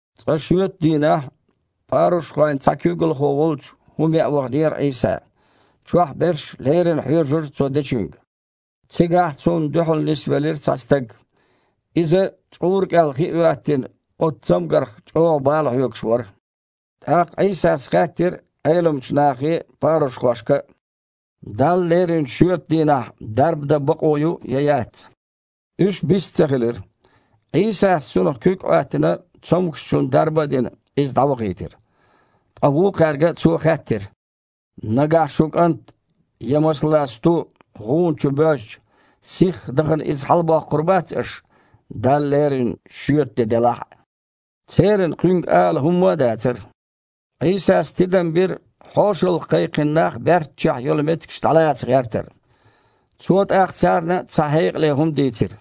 Цкъа шоьтан дийнахь парушхойн цхьа куьйгалхо волчу хІума яа ваханера Іийса. Чохь берш леррина хьоьжура Цо дечуьнга. Цигахь Цунна дуьхьал нисвелира цхьа стаг. Иза, чкъура кІел хи а хІоьттина, оцу цамгарх чІогІа бала хьоьгуш вара. ТІаккха Іийсас хаьттира Іеламчу нахе а, парушхошка а: «Далла леринчу шоьтан дийнахь дарба дан бакъо ю я яц?» Уьш бист ца хилира. Іийсас, цунах куьг а Іоьттина, цомгушчунна дарба а дина, иза дІавахийтира. Ткъа вукхаьрга Цо хаьттира: «Нагахь шун кІант я, масала, сту гІуна чу боьжча, сихха дахана иза хьалабоккхур бац аш, Далла леринчу шоьтан де делахь а?» Церан Кхуьнга ала хІумма а дацара. Іийсас тидам бира хьошалгІа кхайкхина нах баьрччехь йолу меттигаш дІалаца гІертар. Цо тІаккха царна цхьа хьекъале хІума дийцира: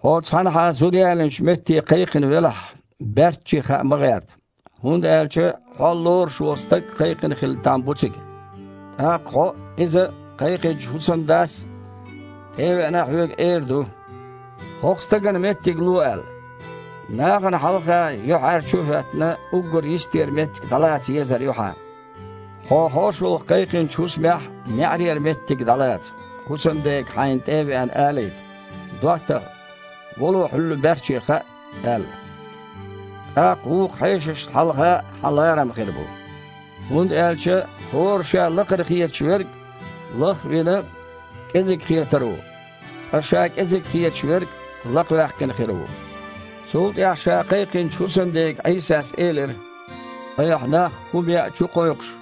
«Хьо цхьанхьа зуда ялийначу метте кхайкхина велахь, баьрчче хаа ма гІерта, хІунда аьлча хьол лоруш волу стаг а кхайкхина хила там бу цига. ТІаккха хьо а, иза а кхайкхинчу хІусамдас, тІе а веана, хьоьга эр ду: „ХІокху стагана меттиг ло“, – аьлла. Нахана хьалха юьхьІаьржачу а хІоьттина, уггар йистера меттиг дІалаца езар ю хьан. Хьо хьошалгІа кхайкхинчу хІусамехь неІарера меттиг дІалаца, хІусамдега, хьайна тІе а веана, алийта: „ДоттагІа! Вало, хьуьлла баьрчче хаа“, – аьлла. ТІаккха вукху хьешашна хьалха хьан ларам хир бу, хІунда аьлча хІора ша лакхара хеташ верг, лах а вина, кІезиг хетар ву, ткъа ша кІезиг хеташ верг лакхаваьккхина хир ву». Цул тІаьхьа Ша кхайкхинчу хІусамдега Іийсас элира: «Айхьа нах хІума яа чукхойкхуш,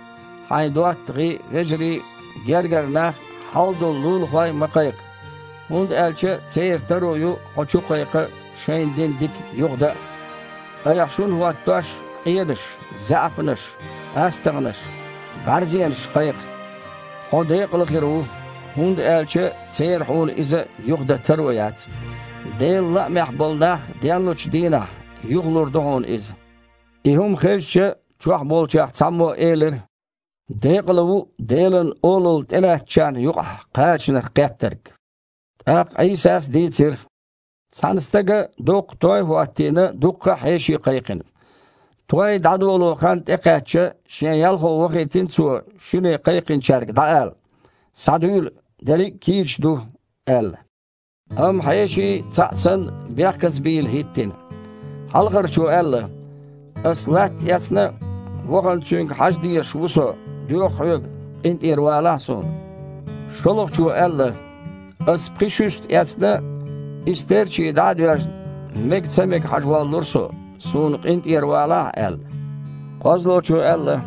хьайн доттагІий а, вежарий а, гергара нах а, хьалдолу лулахой а ма кхайкха, хІунда аьлча церан таро ю хьо чукхайкха а, шайна дина дика юхадан а. Айхьа шун хІоттош, къенаш, заьІапнаш, астагІнаш, бІаьрзенаш кхайкха. Хьо декъала хир ву, хІунда аьлча церан хьуна иза юхадан таро яц. Делан лаамехь болу нах денлучу дийнахь, юхалур ду хьуна иза». И хІума хезча, чохь болчех цхьаммо элира: «Декъала ву Делан Олалла тІелаьцначарна юкъахь кхачанах кхеттарг!» ТІаккха Іийсас дийцира: «Цхьана стага доккха той а хІоттийна, дуккха а хьеший кхайкхина. Той дІадоло хан тІекхаьчча, шен ялхо вахийтина цо шуьне кхайкхинчаьрга дІаала: „Схьадуьйла, дерриг а кийча ду“, – аьлла. Амма хьеший, цхьаъ санна, бехказа бийла хІиттина. Хьалхарчо аьлла: „Ас латта эцна, вахана цуьнга хьажа дезаш ву со, доьху хьоьга, къинтІера валахь суна“. ШолгІачо аьлла: „Ас пхи шуьста эцна, и стерчий дІа а доьжна, мега ца мега хьажа воллура со. Суна къинтІера валахь“, – аьлла. КхозлагІчо аьлла: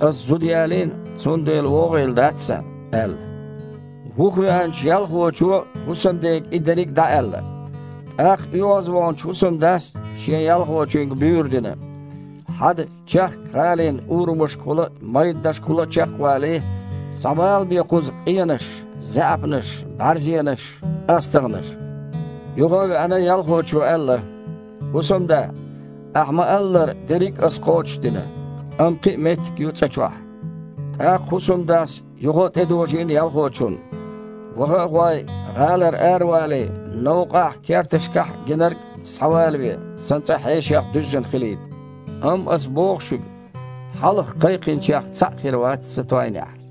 „Ас зуда ялийна, цундела вогІийла дац сан“, – аьлла. Вухавеанчу ялхочо хІусамдега и дерриг дІааьлла. ТІаккха оьгІазваханчу хІусамдас шен ялхочуьнга буьйр дина: „Хьада, чехкка гІалин урамашкахула а, майданашкахула а чекхвалий, схьабалабе кхуза къенаш, заьІапнаш, бІаьрзенаш, астагІнаш“. Юха а веана, ялхочо аьлла: „ХІусамда! Ахь ма-аллара, дерриг а ас кхочушдина, амма кхин а меттиг ю цІа чохь“. ТІаккха хІусамдас юха а тІедожийна ялхочунна: „Ваха а гІой, гІалара аравалий, новкъахь а, керташкахь а гинарг схьавалаве, сан цІа хьешех дуьззина хилийта. Амма, ас боху шуьга, хьалха кхайкхинчех цхьаъ хир вац сан тойнехь“».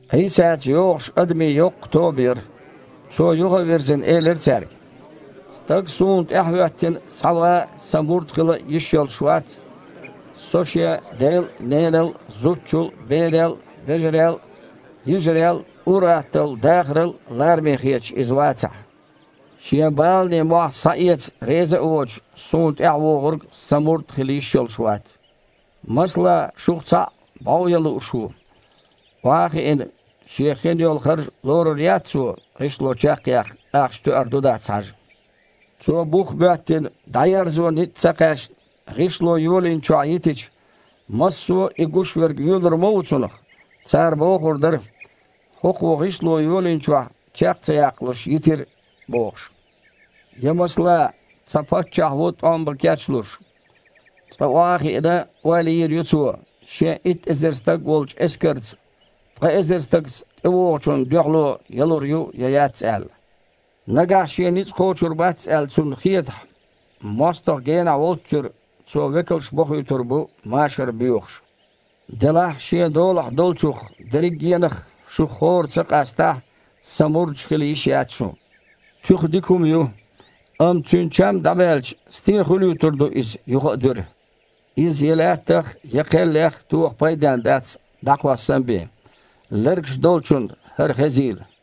Іийсаца йогІуш адамийн йоккха тоба яра. Цо, юха а вирзина, элира цаьрга: «Стаг Суна тІаьхьахІоьттина схьаван а, Сан мурд хила а йиш йолуш вац, Со шен дел а, ненал а, зудчул а, берел а, вежарел а, йижарел а, ур-атталла дахарал а лараме хеташ иза вацахь. Шен баланийн мохь схьаэца реза а воцуш, Суна тІаьхьавогІург Сан мурд хила йиш йолуш вац. Масала, шух цхьаъ бІов ян лууш ву. Охьа а хиина, шен хин йолу харж лорур яц цо, гІишло чекхъяккха ахча тоьар ду дац хьажа? Цо, бух а боьттина, дІаерзо ницкъ а ца кхаьчна, гІишло йолийначохь йитича, массо а и гуш верг воьлур ма ву цунах. Цара бохур дара: „ХІокхо гІишло йолийначохь чекх а ца яккхалуш йитира“, – бохуш. Я, масала, цхьа паччахь ву тІом бан кечлуш. Цкъа, охьа а хиъна, ойла йийр ю цо, шен итт эзар стаг волчу эскарца ткъа эзар стагаца тІевогІучунна дуьхьало ялур ю, я яц аьлла. Нагахь шен ницкъ кхочур бац аьлла, цунна хетахь, мостагІа генахь волччуьра, цо векалш бохуьйтур бу машар боьхуш. Делахь, шен долахь долчух дерригенах шух хІора ца къастахь, Сан мурдаш хила йиш яц шун. Туьха дика хІума ю, амма цуьнан чам дІабаьлча, стен хуьлуьйтур ду иза юха а дуьра? Иза я лаьттах а, я кхеллех а тоха пайденна дац, дІакхоссан бен. Лергаш долчунна хІара хезийла!»